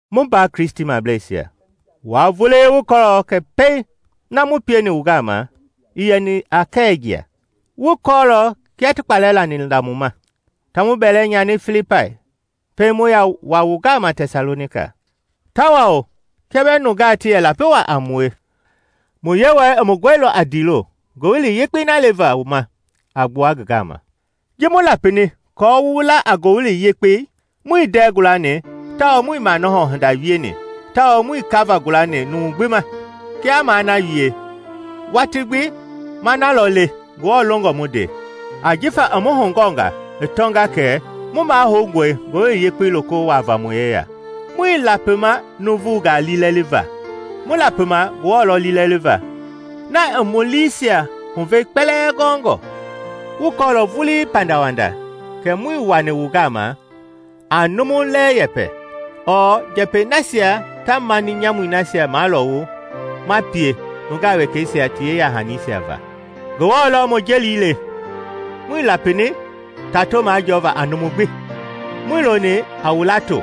Mu mbaa Kristimableisia, wua vulii wu kɔɔlɔ kɛ pei na mu pieni wu gama ii yɛni a kɛwɛ jia. Wu kɔɔlɔ kia ti kpalɛ lani la mu ma, ta mu bɛlɛ nyani Filipai pɛiŋ mu yaa wa wu gama Tɛsalonika. Tawao kia bɛɛ nungaa ti yɛ lapi waa a mue, mu Yewɔɛi i mu gɔilɔ a ndiilo Ngowili Yekpei na leva wu ma a gbua ngi gama. Ji mu lapini aako wu la a Ngowili Yekpei muii ndɛɛ gualani tawao muii manɔhɔ hinda wieni tawao muii kava gulani numu gbi ma. Kia maa na wie, watii gbi ma na lɔ le Ngewɔ longɔ mu nde, ajifa i mu hugɔɔnga i tɔnga kɛ mu mahoungɔe Ngowili Yekpei loko wuava mu yeya. Muii lapima nuuvungaa liilɛliva, mu lapima Ngewɔ lɔ liilɛliva, na i mu liisia huvei kpɛlɛɛ gɔɔngɔ. Wu kɔɔlɔ vuli pandawanda kɛ muii wani wu gama a numu lɛ yɛpɛ ɔɔ njɛpɛi nasia ta mani nyamui nasia malɔwu ma pie nungaa wekɛisia ti yeya-hanisia va. Ngewɔ lɔ mu jeli le. Muii lapini tato majɔɔva a numu gbi, muii loni a wu lato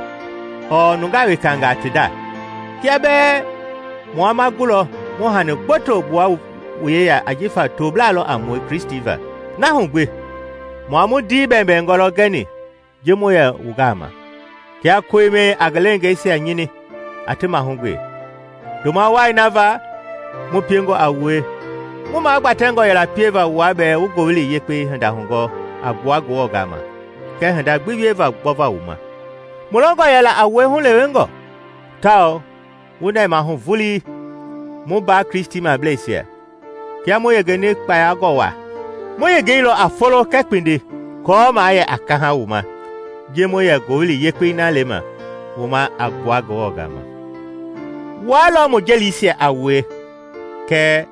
ɔɔ nungaa wekangaa ti nda, kia bɛɛ mua ma gulɔ mu hani gboto gbua wu yeya ajifa toblaa lɔ a mue Kristi va. Na hu gbi mua mu ndii bɛbɛngɔ lɔ gɛni ji mu yɛ wu gama, kia koimɛi a ngi leengeisia nyini, a ti mahugbe. Ndoma wai na va mu piengɔ a wue, mu magbatɛngɔ yɛla pieva wua bɛɛ wu Ngowili Yekpei hinda hugɔɔ a gbua Ngewɔ gama kɛɛ hinda gbi wieva gbɔva wu ma. Mu longɔ yɛla a wue hulewengɔ. Taa wu nɛmahu vulii, mu mbaa Kristimableisia, kia mu yengeni kpayangɔ waa! Mu yengeilɔ a folo kɛɛ kpindi aako maa yɛ a kaha wu ma ji mu yɛ Ngowili Yekpei na lema wu ma a gbua Ngewɔ gama. Wua lɔ mu jelisia a wue kɛɛ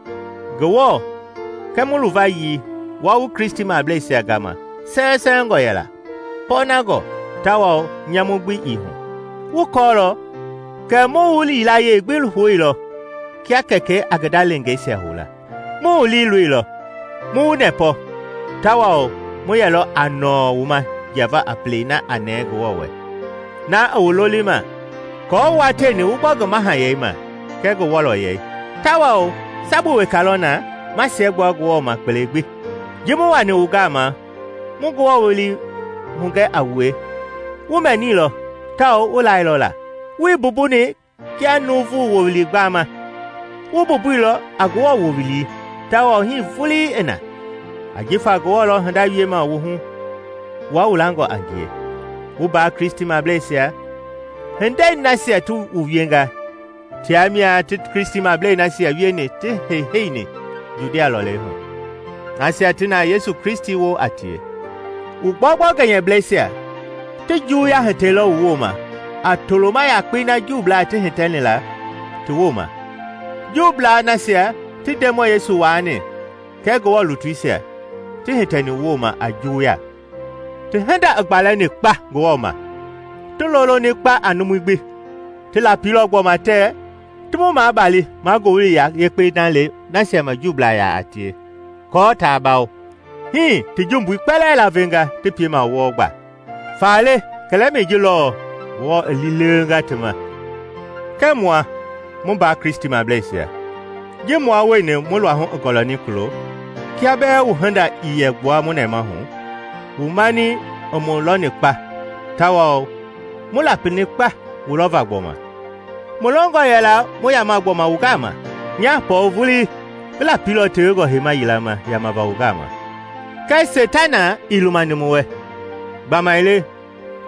Ngewɔ kɛ mu luvayii wua wu Kristimableisia gama sɛwɛsɛwɛngɔ yɛla, pɔɔnangɔ, tawao nyamu gbi ii hu. Wu kɔɔlɔ kɛ mu wu yilayee gbi houilɔ kia kɛkɛi a ngi nda leengeisia hou la. Mu wu liiloilɔ, mu wu nɛpɔ, tawao mu yɛlɔ a nɔɔ wu ma jiava a pelei na a nɛɛ Ngewɔ wɛ na i wu lolima aako wua tieni wu gbɔ ngi Mahayɛi ma kɛɛ ngi wɔlɔyɛi. Tawao sabu weka lɔ na ma siɛgbua Ngewɔ ma kpele gbi. Ji mu wani wu gama mu Ngewɔ wowili hugɛ a wue, wu mɛniilɔ tawao wu lailɔ la, wuii mbumbuni kia nuuvu wowili gbama, wu mbumbuilɔ a Ngewɔ wowili, tawao hii vulii i na. Ajifa Ngewɔ lɔ hinda wiema wu hu wua wu langɔ a ngie. Mu mbaa Kristimableisia, hindei nasia ti wu wienga tia mia ti Kristimablei nasia wieni ti heiheini Judia lɔlei hu, nasia ti na Yesu Kristi woo a tie. Wu gbɔugbɔu gɛnyɛblɛisia ti juwuya hitɛilɔ wu wooma a toloma yakpei na Juublaa ti hitɛni la ti wooma, Juublaa nasia ti Ndemɔi Yesu waani kɛɛ Ngewɔ lutuisia, ti hitɛni mu wooma a juwuya. Ti hinda i gbalɛni kpa Ngewɔ ma! Ti loloni kpa a numui gbi! Ti lapilɔ gbɔma tɛɛ ti mu maabali maa Ngowili Yekpei na le nasia ma Juublaa yaa tie kɔɔ taa bawo. Hii ti jumbui kpɛlɛɛ laavenga ti piema wɔɔ gba. Faale kɛlɛmɛi ji lɔɔ, Ngewɔ i liilewenga ti ma. Kɛɛ mua, mu mbaa Kristimableisia, ji mua wueni mu luahu i gɔlɛni kulo, kia bɛɛ wu hinda ii yɛ gbua mu nɛmahu, wu mani i mu lɔni kpa tawao mu lapini kpa wu lɔva gbɔma! Mu longɔ yɛla mu yama gbɔma wu gama. Nya, Pɔɔl vulii ngi lapilɔ tewengɔ heima yila ma yamava wu gama, kɛɛ Seitana ii lumani mu wɛ. Gbamaile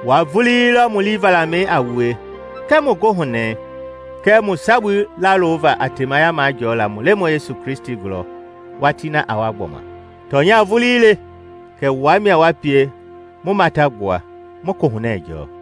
wua vulii lɔ mu lii valamɛi a wue kɛɛ mu goohunɛi kɛɛ mu sabui lawova a temaya majɔɔla mu Lemɔi Yesu gulɔ watii na a wa gbɔma. Tɔnya vulii le kɛ wua mia wa pie mu matagbua, mu kohunɛ jɔɔ!